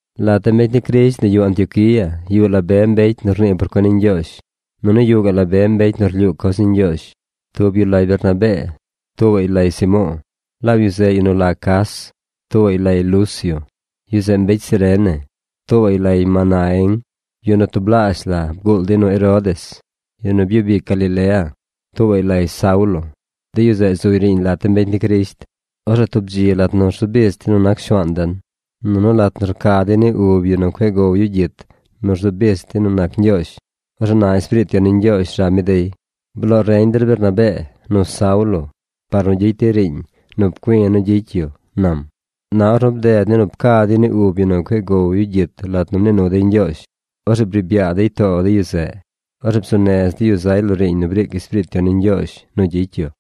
Lat de mbecy ni Crisht nu yuꞌ Antioquía yuꞌ la be mbecy nu rnii por cuen ni Ñgyoozh, nunu yuꞌ gaꞌ la be mbecy nu rlyuu coz ni Ñgyoozh. Tub yu lay Bernabee. Tuubaꞌy lay Simo̱o̱, laab yu zeꞌ yu nu la Cas. Tuubaꞌy lay Lucio, yu zeꞌ mbecy Cirene. Tuubaꞌy lay Manaén, yu nu tublaazh la bguul dey nu Herodes, yu nu byub ic Galilea. Tuubaꞌy lay Saulo. De yu zeꞌ zuy riiñ lat de mbecy ni Crisht. Orzeꞌ tub dzi lat nu rzu bich dey nu nac Shuaan den, nunu lat nu rca dey ni ub yu nu cueꞌ gow yu gyit nu rzu bich dey nu nac Ñgyoozh, orzeꞌ na Espiriit Yon ni Ñgyoozh rab mi dey: ―Bloo reñ der Bernabee nu Saulo par nu gyicy dey riiñ nu pcui̱ nu gyicy yu ―nam. Na ornu bded ni nu pca dey ni ub yu nu cueꞌ goy gyit lat nu mnii nu dey Ñgyoozh, orzeꞌ briib yaa dey too de yu zeꞌ. Orzeꞌ bzuu nez dey yu zay lo riiñ nu briic Espiriit Yon ni Ñgyoozh nu gyicy yu.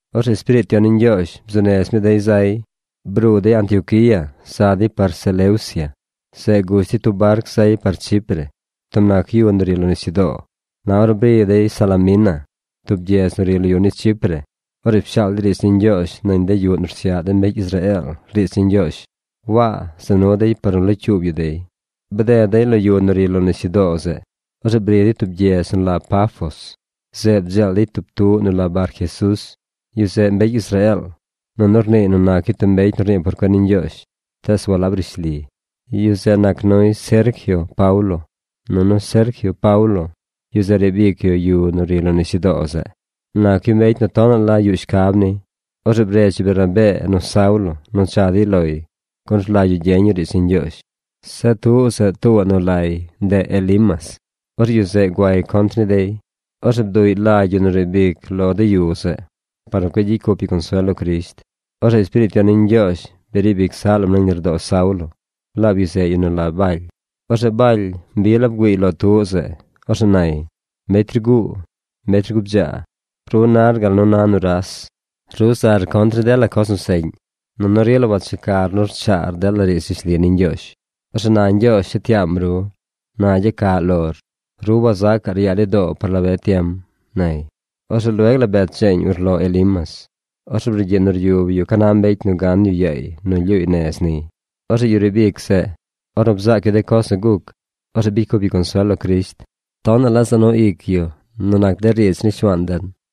Orzeꞌ Espiriit Yon ni Ñgyoozh bzuu nez mi dey zay. Bruu dey Antioquía za dey par Seleucia. Zeꞌ gush dey tub barc zay par Chipre, tub nac yu nu ri lo nisyudoo. Na ornu bri dey Salamina, tub gyedz nu ri lo yu ni Chipre, orzeꞌ pshaal dey riidz ni Ñgyoozh nañ de yuꞌ nu rsyaꞌ de mbecy Israeel riidz ni Ñgyoozh. Waa za nuy dey par nu locyuub yu dey. Bded dey lo yu nu ri lo nisyudoo zeꞌ. Orzeꞌ bri dey tub gyedz nu la Pafos. Zeꞌ bdzeel dey tub tuꞌ nu la Barjesús. Yu zeꞌ mbecy Israeel, nunu rniiy nu nac yu tub mbecy nu rnii por cuen ni Ñgyoozh, tees walab rishli. Yu zeꞌ nac nuy Sergio Paulo. Nunu Sergio Paulo, yu zeꞌ riib ic yu yu nu ri lo nisyudoo zeꞌ. Nac yu mbecy nu tonaꞌ la yuꞌ shcab ni. Orzeꞌ bredz yu Bernabee nu Saulo nu cha dey loy gun rlagy yu gyeñ yu riidz ni Ñgyoozh. Zeꞌ tuꞌ zeꞌ tuubaꞌ nu lay ndeꞌ Elimas. Orzeꞌ yu zeꞌ guay contr ni dey. Orzeꞌ bduꞌy lagy yu nu riib ic lo de yu zeꞌ, par nu cueꞌ gyicy cup yu consuel lo Crisht. Orzeꞌ Espiriit Yon ni Ñgyoozh briib ic zaꞌ lam nañ lardoo Saulo, laab yu zeꞌ yu nu la Baly. Orzeꞌ Baly mbi la bgüiiy lo tuꞌ zeꞌ. Orzeꞌ nay: ―¡Mbecy rguu, mbecy rgubdzaa, ru nar gal nu na nuras! Ru zar contr ni dela coz nu seꞌñ, nunu rila wachecar nu rchaar dela riidz rishli ni Ñgyoozh. Orzeꞌ na Ñgyoozh shet yaam ru. Na gyacaꞌ lor. Ru wazacaꞌr yaa ni doo par la be tiem ―nay. Orzeꞌ lueg la bet dzeeñ urlo Elimas. Orzeꞌ brugyiꞌ ryub yu ca na mbecy nu gan yu yaay nu lyuuy nez niy. Orzeꞌ yu riib ic zeꞌ, ornu bzaac yu de coz nu guc, orzeꞌ bicy cup yu consuel lo Crisht. Tonaꞌ la za nu ic yu nu nac de riidz ni Shuaan den.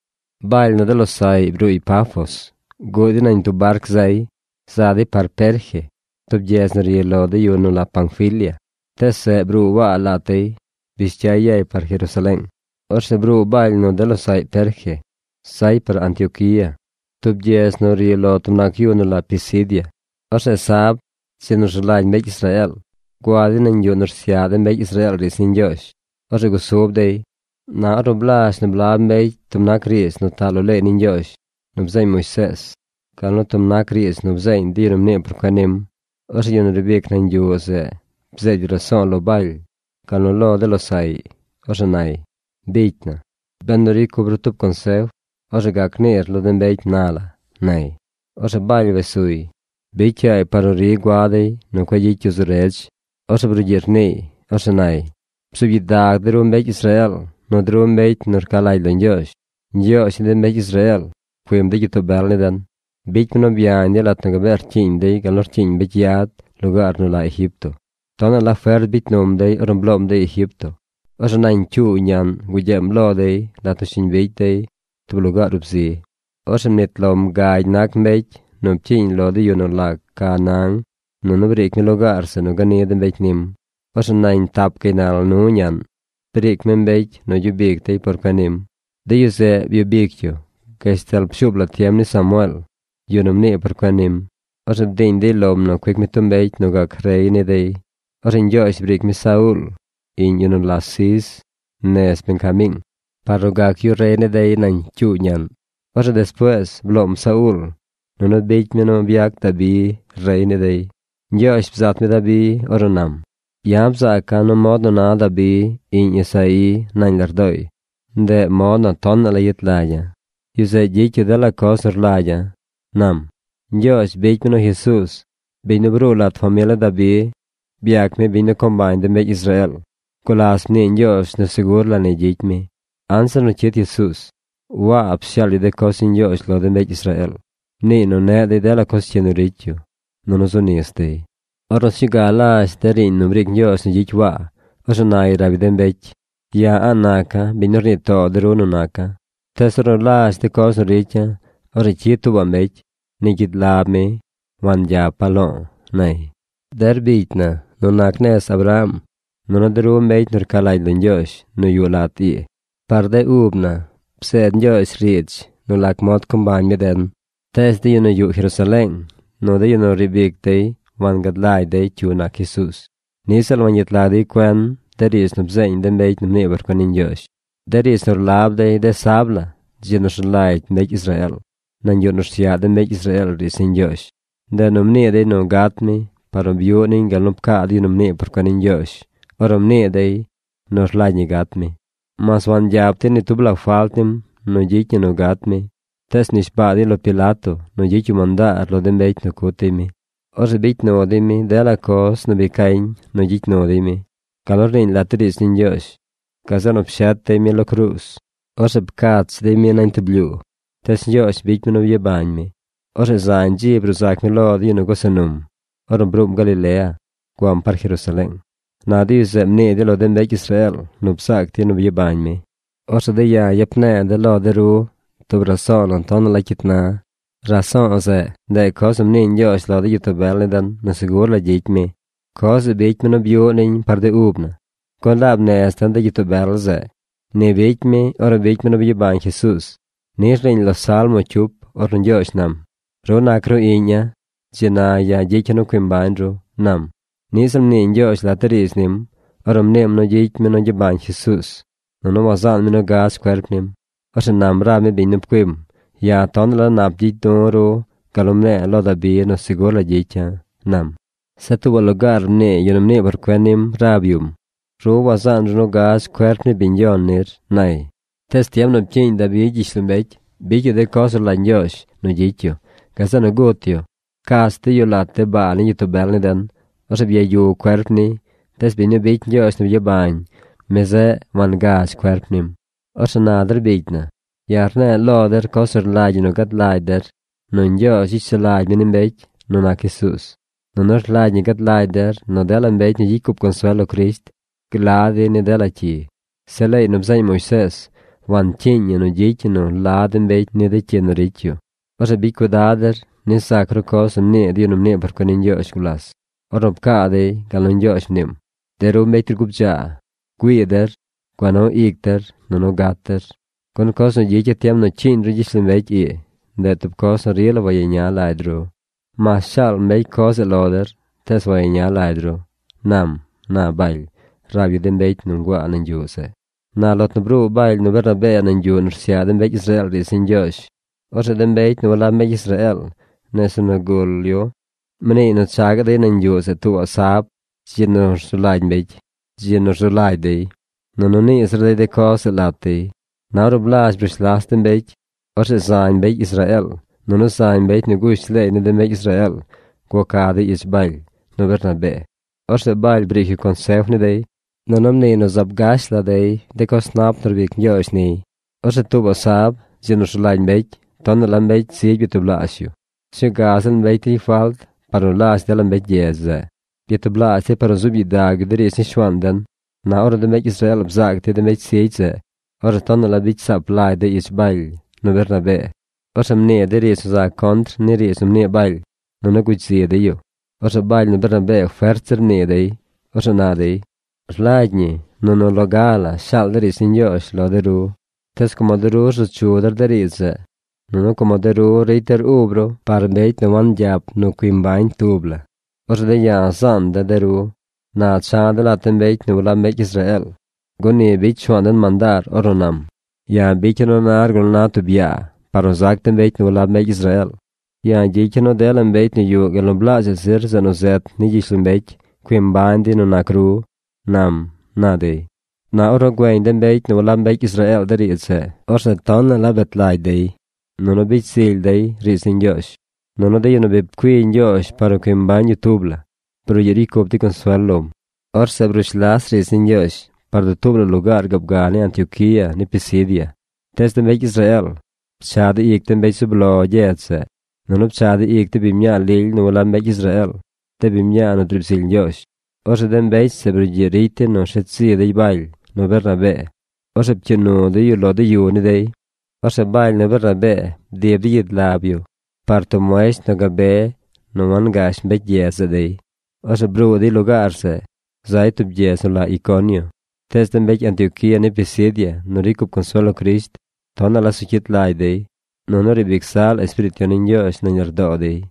Baly nu de losaꞌy bruuy Pafos, guꞌ dey nañ tub barc zay. Za dey par Perge, tub gyedz nu ri lo de yu nu la Panfilia. Tees zeꞌ bruu Waa lat dey. Bish cyay yay par Jerusaleeng. Orzeꞌ bruu Baly nu de losaꞌy Perge. Zay par Antioquía, tub gyedz nu ri lo tub nac yu nu la Pisidia. Orzeꞌ sab, dzi nu rzu lagy mbecy Israeel, gua dey nañ yuꞌ nu rsyaꞌ de mbecy Israeel riidz ni Ñgyoozh. Orzeꞌ gusub dey. Na ornu blazh nu blab mbecy tub nac riidz nu taꞌ lo leey ni Ñgyoozh nu bzeeñ Moisees, gal nu tub nac riidz nu bzeeñ de yu nu mnii por cuen nim, orzeꞌ yu nu riib ic nañ yuꞌ zeꞌ bzeed yu raso̱o̱ lo Baly, gal nu lo de losaꞌy. Orzeꞌ nay: ―Bicy na, benu ricy cup ru tub consef, orzeꞌ gac niir lo de mbecy na la ―nay. Orzeꞌ Baly wes suy. Bicy yaay par nu ri gua dey nu cueꞌ gyicy yu zu redz. Orzeꞌ brugyiꞌ rniiy. Orzeꞌ nay: ―Bzuub gyidag de ru mbecy Israeel nu de ru mbecy nu rca lagy lo Ñgyoozh. Ñgyoozh ni de mbecy Israeel pcuim de gyitoo bel ni den. Bicy mi nu byañ dey lat nu gabee rcyiiñ dey gal nu rcyiiñ mbecy yad lugaar nu la Egipto. Tonaꞌ la fert bicy num dey ornu bloom dey Egipto. Orzeꞌ nañ cyuu ñaꞌn gugyeem lo dey lat nu shiñ bicy dey tub lugaar ub zi. Orzeꞌ mnit lom gagy nac mbecy nu pcyiiñ lo de yu nu la Canaán, nunu briic mi lugaar zeꞌ nu gani de mbecy nim. Orzeꞌ nañ tap gaynal nu ñaꞌn, briic mi mbecy nu gyub ic dey por cuen nim. De yu zeꞌ byub ic yu gashtal pshuub la tiem ni Samueel, yu nu mnii por cuen nim. Orzeꞌ bdiiñ dey lom nu cuic mi tub mbecy nu gac rey ni dey. Orzeꞌ Ñgyoozh briic mi Sauul, iꞌñ yu nu la Cis, nez Benjamiing, par nu gac rey ni dey nañ cyuu ñaꞌn. Orzeꞌ despuees bloom Sauul nunu bicy mi nu byac Dabi rey ni dey. Ñgyoozh bzat mi Dabi ornu nam: “Ya̱ bzaaca̱ nu mod nu na Dabi iꞌñ Isaí nañ lardooy, ndeꞌ mod nu tonaꞌ la yet lagya̱. Yu zeꞌ gyicy yu dela coz nu rlagya̱”, nam. Ñgyoozh bicy mi nu Jesuuz, biñ nu bruu lat famil ni Dabi, byac mi biñ nu co mbañ de mbecy Israeel. Gulas mnii Ñgyoozh nu segur la ni gyicy mi. Anzir nu cyid Jesuuz, Waa pshaal yu de coz ni Ñgyoozh lo de mbecy Israeel. Mniiy nu neꞌ dey dela coz cyi nu ricy yu, nunu zu nis dey. Ornu sñuu ga lazh de riiñ nu briic Ñgyoozh nu gyicy Waa, orzeꞌ nay rab yu de mbecy: “Ya̱ a̱ꞌ naca̱ biñ nu rnii too de ru nu naca̱, tees ornu lazh de coz nu ricya̱, orzeꞌ cyid tuubaꞌ mbecy. Ni gyid lab mi wangyapa̱ lo̱o̱”, nay. ’Der bicy na nu nac nez Abraham, nunu de ru mbecy nu rca lagy lo Ñgyoozh nu yuꞌ lat ii, par de ub na bzeed Ñgyoozh riidz nu lac mod co mbañ mi den. Tees de yu nu yuꞌ Jerusaleeng nu de yu nu riib ic dey wangad lagy dey cyu nac Jesuuz. Niꞌ ziꞌl wangyet lag dey cuen de riidz nu bzeeñ de mbecy nu mnii por cuen ni Ñgyoozh, de riidz nu rlab dey de sab la, dzi nu rzu lagy mbecy Israeel, nañ yuꞌ nu rsyaꞌ de mbecy Israeel riidz ni Ñgyoozh. Ndeꞌ nu mnii dey nu gat mi par nu byuꞌ niñ gal nu pcaa de yu nu mnii por cuen ni Ñgyoozh ornu mnii dey nu rlagy ñi gat mi. Mas wangyap dey ni tub la falt nim nu gyicy ñi nu gat mi, tees mnishbaa dey lo Pilato nu gyicy yu mandaar lo de mbecy nu cut dey mi. Orzeꞌ bicy nu dey mi dela coz nu bi cañ nu gyicy nu dey mi, gal nu rniiñ lat de riidz ni Ñgyoozh. Gazeꞌ nu pshet dey mi lo cruuz. Orzeꞌ pcach dey mi nañ tub blyuu. Tees Ñgyoozh bicy mi nu byabañ mi. Orzeꞌ zañ dzi bruu zac mi lo de yu nu gusa num ornu bruum Galilea guam par Jerusaleeng. Na de yu zeꞌ mnii dey lo de mbecy Israeel nu bzaac dey nu byabañ mi. ’Orzeꞌ de̱ ya̱ yap ne̱e̱ de̱ lo de ru tub riidz nu tonaꞌ la cyit na. Riidz zeꞌ, ndeꞌ coz nu mnii Ñgyoozh lo de gyitoo bel ni den nu segur la gyicy mi. Coz zeꞌ bicy mi nu byuꞌ niñ par de ub na, gun laab nez den de gyitoo bel zeꞌ. Ni bicy mi ornu bicy mi nu byabañ Jesuuz. Ni rniiñ lo salmo cyup ornu Ñgyoozh nam: “Ru nac ru Iꞌña̱. Dzi na ya̱ gyicya̱ nu cui mbañ ru”, nam. Niꞌ ziꞌl mnii Ñgyoozh lat de riidz nim, ornu mniim nu gyicy mi nu gyabañ Jesuuz, nunu wazaan mi nu gadz cuerp nim. Orzeꞌ nam rab mi biñ nu pcuim: “Ya̱ tonaꞌ la nap gyicy du̱ ru gal nu mne̱e̱ lo Dabi nu segur la gyicya̱”, nam. Zeꞌ tuubaꞌ lugaar mnii yu nu mnii por cuen nim rab yum: “Ru wazaan ru nu gadz cuerp ni biñ Yon nir”, nay. Tees tiem nu pcyiiñ Dabi gyishlombecy, bicy yu de coz nu rlagy Ñgyoozh nu gyicy yu. Gazeꞌ nu gut yu. Pcach dey yu lat de baa ni gyitoo bel ni den. Orzeꞌ byayu cuerp niy. Tees biñ nu bicy Ñgyoozh nu byabañ, mi zeꞌ wangadz cuerp nim. Orzeꞌ na der bicy na, ya̱ rne̱e̱ lo der coz nu rlagy ñi nu gad lagy der nu Ñgyoozh gyicy sulagy mi ni mbecy nu nac Jesuuz. Nunu rlagy ñi gad lagy der nu dela mbecy nu gyicy cup consuel lo Crisht gla dey ni dela cyi. Zeꞌ leey nu bzeeñ Moisees wancyiiñ ñi nu gyicy ñi nu la de mbecy ni de cyi nu ricy yu. Orzeꞌ bicy cuidad der nis zac ru coz nu mnii de yu nu mnii por cuen ni Ñgyoozh gulas, ornu pcaa dey gal nu Ñgyoozh mniim: De ru mbecy rgubdzaa, güii der. Gua nu ic der, nunu gat der, gun coz nu gyicya̱ tiem nu cyiiñ ru gyishlombecy ii, ndeꞌ tub coz nu rila wayeña lagy ru. Mas shaal mbecy coz zeꞌ lo der, tees wayeña lagy ru, nam ―na Baly rab yu de mbecy nu nguaa nañ yuꞌ zeꞌ. Na lat nu bruu Baly nu Bernabee nañ yuꞌ nu rsyaꞌ de mbecy Israeel riidz ni Ñgyoozh, orzeꞌ de mbecy nu walab mbecy Israeel nese nu gul yu mniiy nu cha gaꞌ dey nañ yuꞌ zeꞌ tuubaꞌ sab, dzi nu zu lagy dey, nunu nii zir dey de coz zeꞌ lat dey. Na ornu blaazh brush las de mbecy, orzeꞌ zañ mbecy Israeel, nunu zañ mbecy nu gush leey ni de mbecy Israeel guaca dey ich Baly nu Bernabee. Orzeꞌ Baly briic yu consef ni dey, nunu mniiy nu zaab gash la dey de coz nap nu rbic Ñgyoozh niy. Orzeꞌ tuubaꞌ sab, dzi nu rzu lagy mbecy, tonaꞌ la mbecy zigy byatublaazh yu. Sñuu ga ziꞌl mbecy ricy falt par nu lazh dela mbecy gyedz zeꞌ. Byatublaazh dey par nu zuub gyidag yu de riidz ni Shuaan den. Na ornu de mbecy Israeel bzaac dey de mbecy zigy zeꞌ, orzeꞌ tonaꞌ la bicy saap lagy dey ich Baly nu Bernabee. Orzeꞌ mnii dey riidz nu za contr ni riidz nu mnii Baly, nunu gugy zi dey yu. Orzeꞌ Baly nu Bernabee fert zir mnii dey. Orzeꞌ na dey: ―Rlagy ñi nu nu loga la shaal de̱ riidz ni Ñgyoozh lo de ru. Tees como de ru rzu chu der de riidz zeꞌ, nunu como de ru ricy der ub ru par mbecy nu wangyap nu cui mbañ tub la, orzeꞌ de̱ ya̱ zaan de̱ de ru. Na cha̱ de̱ lat de mbecy nu walab mbecy Israeel, gun ni bicy Shuaan den mandaar ornu nam: Ya̱ bicya̱ nu nar gal nu na tub yaa par nu zac de mbecy nu walab mbecy Israeel. Ya̱ gyicya̱ nu dela mbecy nu yuꞌ gal nu blaazhaꞌ zir zeꞌ nu zet ni gyishlombecy cui mbañ dey nu nac ru, nam ―na dey. Na ornu güeñ de mbecy nu walab mbecy Israeel de riidz zeꞌ, orzeꞌ tonaꞌ la bet lagy dey, nunu bicy zily dey riidz ni Ñgyoozh. Nunu de yu nu bi pcui Ñgyoozh par nu cui mbañ yu tub la, brugyiꞌ ricy cup dey consuel lom. Orzeꞌ brush las riidz ni Ñgyoozh par dutuub la lugaar gaab ga ni Antioquía ni Pisidia. Tees de mbecy Israeel pchaꞌ dey ic de mbecy zub lo gyedz zeꞌ, nunu pchaꞌ dey ic de biñ mñaa lily nu walab mbecy Israeel, de biñ mñaa nu driib zily Ñgyoozh. Orzeꞌ de mbecy zeꞌ brugyiꞌ ricy dey nu rsheed zi dey Baly nu Bernabee. Orzeꞌ pcyuu nu dey yu lo de yu ni dey. Orzeꞌ Baly nu Bernabee bdib dey gyid lab yu par tub muesht nu gabe nu wangash de mbecy gyedz zeꞌ dey. Orzeꞌ bruu dey lugaar zeꞌ, zay tub gyedz nu la Iconio. Tees de mbecy Antioquía ni Pisidia nu ricy cup consuel lo Crisht tonaꞌ la zu cyit lagy dey, nunu riib ic zaꞌ la Espiriit Yon ni Ñgyoozh nañ lardoo dey.